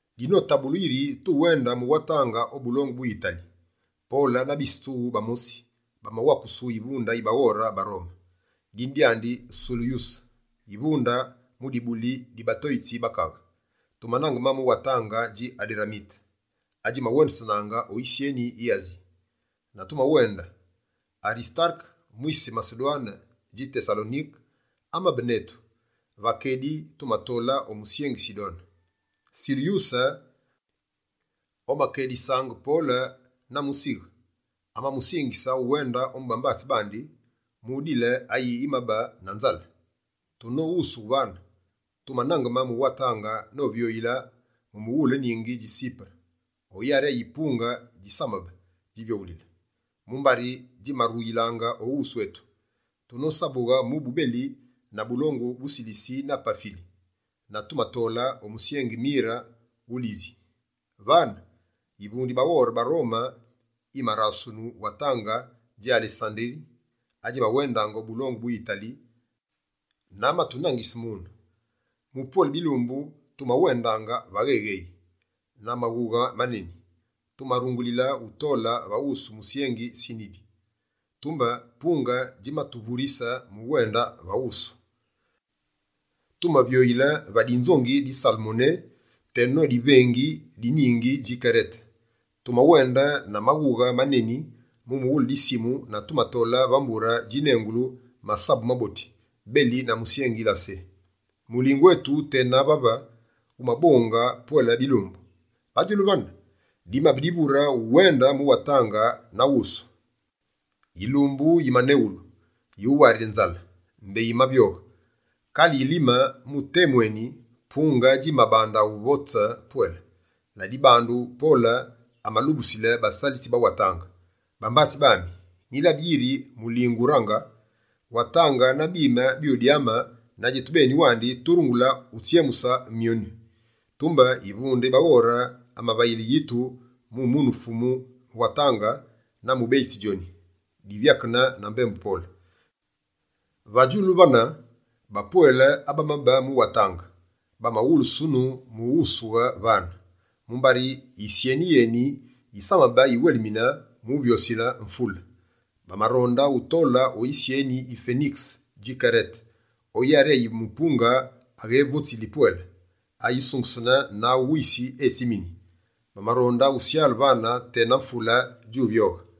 Dinotabulu yiri tuwende mu watange o bulongu bu Yitali, Pole na bise tsughu bamosi, bamawakusu yivunde yi baghore ba Rome, dine dyandi Sulyuse, yivunde mu dibuli di «Batoyitsi ba Kaghe.» Tumanangeme mu watange dji Aderamite, adjimawendesenaange o yisyeni yi Asi, na tumawende. Arisitareke, mwise Masedwane dji Tesalonike, amabe netu. Va kedi tumatole o musyengi Sidone. Sulyuse, omakélisaange Pole na musighe, amamusingise uwende ombu bambatsi bandi, mu udile ayi amabe na nzale. Tunoghusughe vane, tumanangeme mu watange novyoyile mu mughule ningi dji Sipere o yari ayi punge djisamabe djivyoghulile, mumbari djimaruyilaange o wusu yetu. Tunosabughe mubu beli na bulongu bu Silisi na Pafili, na tumatole o musyengi Mire wu Lisi. Vane, yivunde yi baghore ba Rome yimarasunu watange dji Alesanderi, adjimawendaange o bulongu bu Yitali na amatunangise mune. Mu pwele bilumbu, tumawendaange va ghéghéyi. Na maghughe maneni, tumarungulile utole va wusu musyengi Sinide. Tumbe punge djimatuvurise mu uwende na wusu. Tumavyoyile va dinzongi di Salmoné, teno divengi di ningi dji Kerete. Tumawende na maghughe maneni mu mughule disimu na tumatole va mbure djinengule «Masabu Maboti», beli na musyengi Lasé. Mulingu etu tena vave wumabonge pwele bilumbu. Va djulu vane, dimabe divure uwende mu watange na wusu. Yilumbu yimanegulu «yuwarile nzale» mbé yimavyoge. Kale yilime mu temu eni, punge djimabande uvotse pwele. Ladibandu, Pole amalubusili basalitsi ba watange: «Bambatsi bami, nyilabi yiri mulingu wurange. Watange na bime byudyame na djetubeni wandi turungulu utsyemuse myoni.» Tumbe yivunde yi baghore amavayile yitu mu munu fumu watange na mubeyitsi djoni, divyakene na mbembu Pole. Va djulu vane, bapwele abamabe mu watange bamawulusunu mu wusughe vane, mumbari yisyeni yeni yisamabe yiwelimine mu vyosile mvule. Bamaronde utole o yisyeni yi Fenikese dji Kerete, o yari ayi mupunge wughépepili pwele, ayisungesene na awu wisi etsimini. Bamaronde usyale vane, tena mvule djuvyoyile.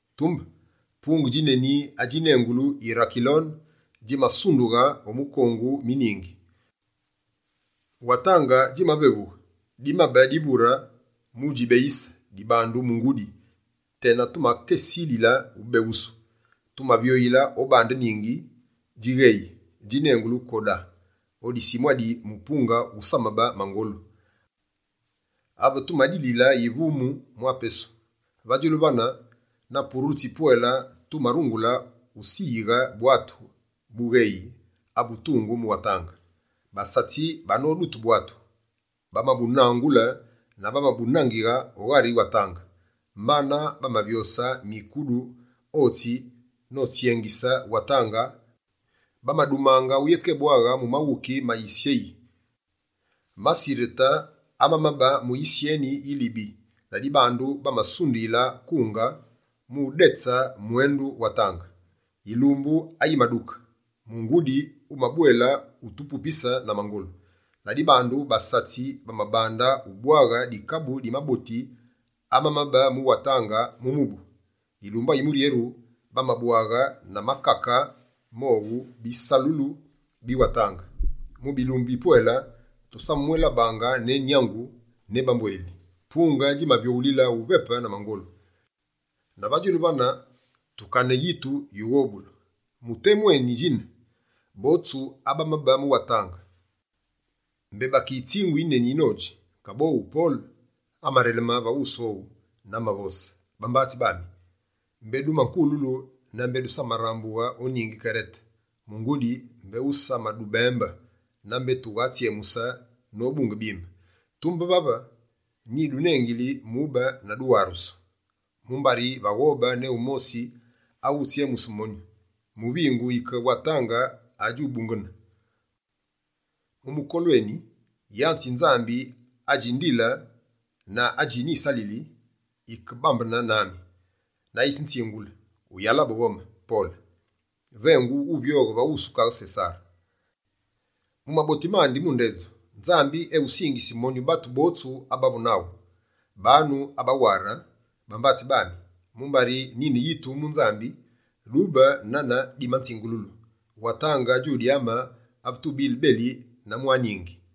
Tumbe, punge djineni adjinengulu «Yirakilone», djimasundughe o mikongu mi ningi. Watange djimavevughe: dimabe divure mu djibeyise dibandu mungudi, tena tumakesilile ubeghusu. Tumavyoyile o bande ningi djigheyi djinengulu Koda, o disimu adi mupunge wusamabe mangolu, ave tumadilile yivumunu mwa pesu. Va djulu vane, na purulu tsipwele tumarungule usiyighe bwatu bugheyi abutungu mu watange. Basatsi banodute bwatu, bamabunangule na bamabunangighe o ghari watange, mbana bamavyose mikudu otsi notsyengise watange mu udji warise. Bamadumaange uyékébwaghe mu maghuki ma yisyeke ma Sirete amamabe mu yisyeni yi Lybi, la dibandu bamasundusile kunge mu udetse mwendu watange. Yilumbu ayimaduke, Mungudi wumabwela utupupise na mangolu, la dibandu basatsi bamabande ubwaghe dikabu di maboti amamabe mu watange mu mubu. Yilumbu ayimuryeru, bamabwaghe na makake mowu, bisalulu bi watange. Mu bilumbu bipwele, tusamamwélabaange ne nyangu, ne bambwuélili. Punge djimavyoghulile uvepe na mangolu. Na va djulu vane, tukane yitu yughobulu. Mu temu eni djine, botsu abamabe mu watange, mbé bakeyitsingu yineni nodji. Kaboghu Pole, amareleme va wusu owu na amavose: «Bambatsi bami, mbé dumakululu na mbé dusamarambughe o ningi Kerete, mungudi mbé usamadubembe na mbé tughatsyemuse nobunge bimi. Tumbe vave, nyidunengili mu ube na duwarusu, mumbari vaghobe ne wumosi awutsyemuse monyu. Muvingu yike watange adjubungene. Mu mukolu eni, yanze yi Nzambi adji ndile na adji nyisalili, yike bambene nami. Na yitsinzingule: “Wuyalabe ghome, Pole! Vengu wuvyoghe va wusu kaghe Sesare. Mu maboti mandi mu ndedju, Nzambi ewusingisi monyu batu botsu abavu naghu.” Banu abaware, bambatsi bami, mumbari nyine yitu mu Nzambi. Dyube nane dimanzingululu. Watange djudyame ave tubile beli na mwa ningi.»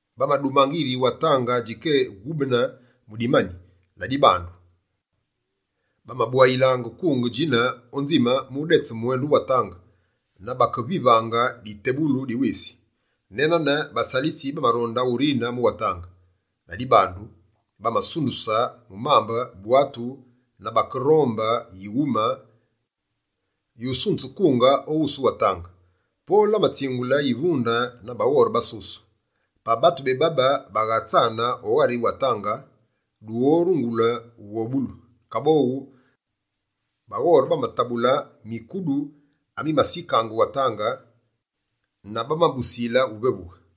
Bamadumange yiri watange djikéwubene mu dimani. Ladibandu, bamabwayile kunge djine o nzime mu udetse mwendu watange na bakevivaange ditebughulu di wisi. Ne nane, basalitsi bamaronde urine mu watange. La dibandu, bamasunduse bwatu mu mambe na bakerombe yighume yusunzile kunge o wusu watange. Pole amatsingule yivunde na baghore basuse: «Pa batu bébaba baghatsane o ghari watange, dughorungulu ughobulu!» Kaboghu, baghore bamatabule mikudu amimasikigha watange na bamabusile uvevughe.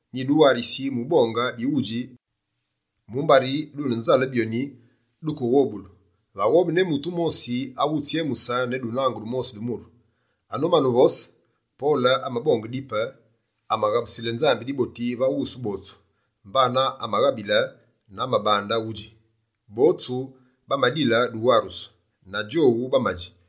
Nyiduwarisi mu ubonge bighudji, mumbari dune nzale byonyi dukeghobulu. Vaghobe ne mutu wumosi awutsyemuse ne dunange dumosi du muru!» Anomane uvose, Pole amabonge dipe, amaghabusile Nzambi diboti va wusu botsu, mbana amabaghabile na amabande udji. Botsu bamadile duwarusu, na djowu bamadji.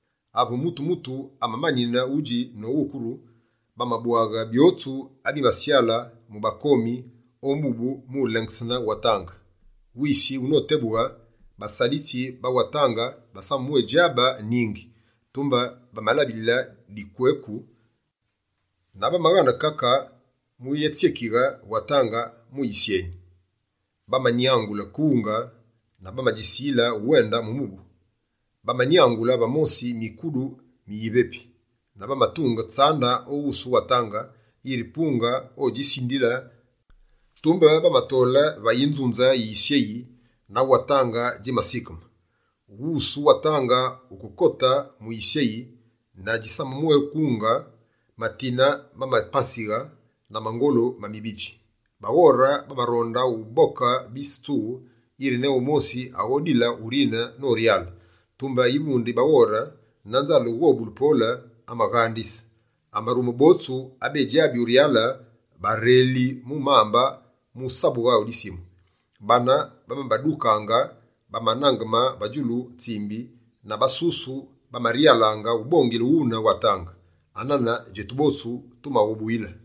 Ave mutu-mutu amamanine udji na uwukuru, bamabwaghe byotsu abimasyale mu bakomi o mubu mu lengsene watange. Wisi wunotebughe, basalitsi ba watange basamamwédjabe ningi, tumbe bamalabile dukweku na bamaghane kake mu utsyekighe watange mu yisyeyi. Bamanyangule kunge na bamadjisile uwende mu mubu. Bamanyangule va mosi mikudu mi yivepi. Na bamatunge tsande o wusu watange, yiri punge odjisindile na bamawendusu o dukweku. Tumbe bamatole va yinzunze yi yisyeyi na watange djimasikeme. Wusu watange wukekote mu yisyeyi na djisamamwékunge, matine mamapanzighe na mangolu ma mibidji. Baghore bamaronde uboke bise tsughu, yiri ne wumosi aghodile urine noryale. Tumbe yivunde yi baghore, na nzale ughobule Pole, amabaghandise. Amarume botsu abédjabi uryale, bareli mu mambe mu usabughe o disimu. Bane bamabadukaange banangeme va djulu tsimbi na basusu bamaryalaange ubongile ghune watange. Anane djetu botsu tumaghobuyile.